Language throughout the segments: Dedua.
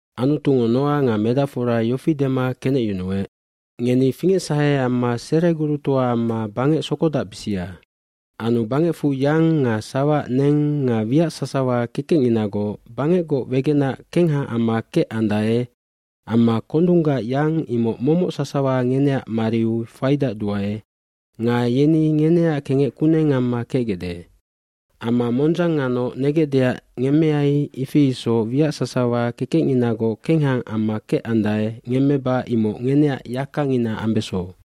aAnutungo Noa nga medacfora yofi dema kenecyunuec, “Ngeni fingecsahe amma seregurutoa amma bangec sokodacbisia. Anu bangecfu yang nga sawaac neng nga wiac sasawa kekecnginagoc bangecgoc wegenac kengha amma kecandae amma kondunggac yang imoc momoc sasawa ngeneac mariu faidacduae nga yeni ngeneac kengec kuneng amma kecgecde. bAmma mondzang nganoc negecdeac ngemmeai ifi isoc wiac sasawa kekecnginagoc kengha amma kecandae ngemmeba imoc ngeneac yakangina ambeso.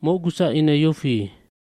dMocgusac ine yofi,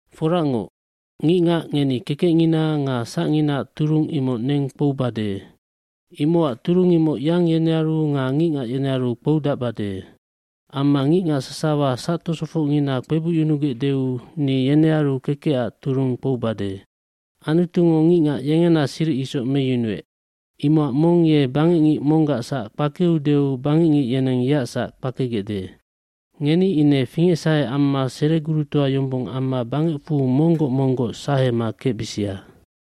Foracngoc, ngicngac ngeni kekecngina nga sacnginaac turung imoc neng kpoubade. Imocac turung imoc yang yenearu nga ngicngac yenearu kpoudacbade. Amma ngicngac sasawa sactosofocngina kpebucyunugecdeu ni yenearu kekecac turung kpoubade. eAnutungo ngicngac yengena siric isoc meyunuec. Imocac mong ye bangecngic monggac sac kpakeudeu bangecngic yeneng yeac sac kpakegecde. fNgeni ine fingecsahe amma seregurutoa yombong amma bangecfu monggoc monggoc sahema kecbisia.”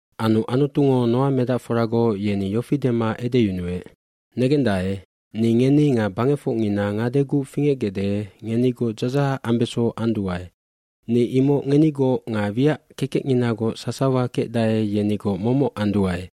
Anu Anutungo Noa medacforagoc yeni yofi dema edeyunuec, “Negendae, ni ngeni nga bangecfocngina ngadeguc fingecgecde ngenigoc dzadzahac ambeso anduae. Ni imoc ngenigoc nga wiac kekecnginagoc sasawa kecdae yenigoc momoc anduae.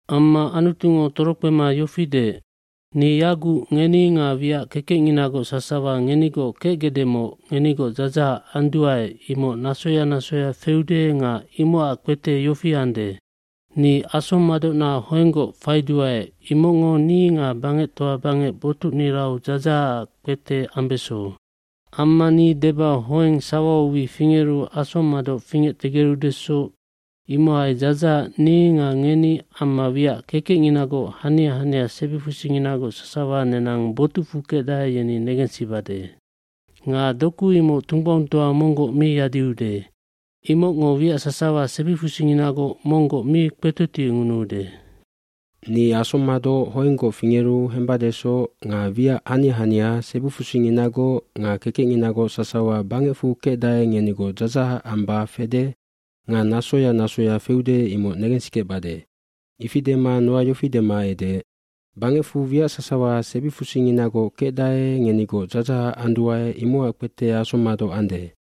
Amma Anutungo torokpema yofi deec, “Ni yaguc ngeni nga wiac kekecnginagoc sasawa ngenigoc kecgecdemoc ngenigoc dzadzahac anduae imoc nasoya nasoya feude nga imocac kpete yofi ande. Ni asommadocnag hoenggoc faiduae imocngo ni nga bangectoa bangec botucnirau dzadzahacac kpete ambeso. Amma ni deba hoeng sawau wi fingeru asommadoc fingectegerudesoc imohai dzadzahac ni nga ngeni amma wiac kekecnginagoc hania hania sebifusinginagoc sasawa nenang botucfu kecdae yeni negensibade. Nga doku imoc tunggbaungtoa monggoc mi yadiude. Imocngo wiac sasawa sebifusinginagoc monggoc mi kpetotiengunuude. Ni asommadoc hoenggoc fingeru hembadesoc nga wiac hania hania sebifusinginagoc nga kekecnginagoc sasawa bangecfu kecdae ngenigoc dzadzahac amba fede nga nasoya nasoya feude amma febesande imoc negensikecbade.” Ifi dema Noa yofi dema edeec, “Bangecfu wiac sasawa sebifusinginagoc kecdae ngenigoc dzadzahac anduae imocac kpete asommadoc ande.”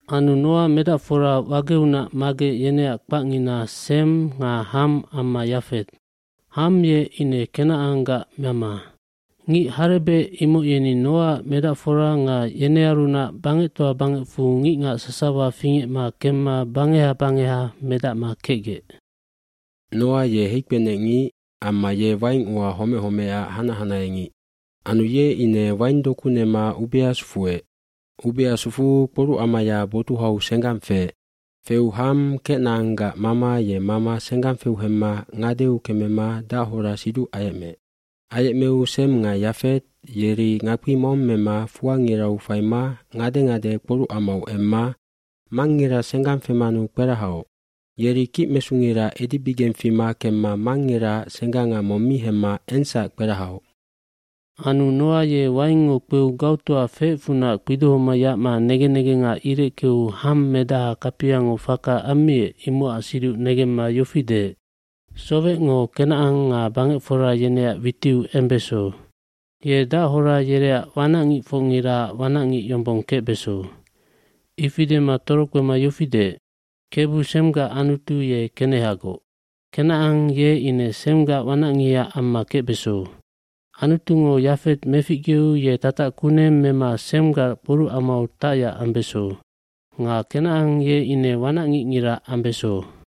Anu Noa medacfora wageunac magec yeneac kpacngina Sem nga Ham amma Yafet. Ham ye ine Kenacanggac mama. Ngic harebec imoc yeni Noaac medacfora nga yenearunac bangectoa bangecfu ngicngac sasawa fingecma kemma bangeha bangeha medacma kecgec. Noa ye heikpenecngic amma ye waing ua homec homecac hanac hanaheangic. Anu ye ine waingdoku nema ubea sufuec. Ubea sufuu kporucamaya botuhau senggang feec. Feu Ham, Kenacanggac mama ye mama senggang feu hemma ngadeu kemema dachora siduc ayecmeec. Ayecmeu Sem nga Yafet yeri ngakpi mong mema fuangirau faima ngade ngade kporucamau emma mangngira senggang femanu kperahaoc. Yeri kicmesungira edibigeng fima kemma mangngiraac sengganga mong mi hemma ensac kperahaoc. Anu Noa ye waingngo kpeu gautoa feecfunac kpidohoma yacma negen negena ireckeu Ham, medaha kapiango faka ammiec imocac siduc negemma yofi deec, “Sowecngo Kenacan nga bangecfora yeneac witiu embeso! Ye dachora yereac wanacngicfocngiraac wanacngic yombong kecbeso.” Ifi dema torokpema yofi deec, Kebu, Semgac Anutu ye kenehagoc. Kenacan ye ine Semgac wanacngiha amma kecbeso. Anutungo Yafet meficgeu ye tatac kuneng mema Semgac kporucamau tacyac ambeso. Nga Kenacan ye ine wanacngingira ambeso.”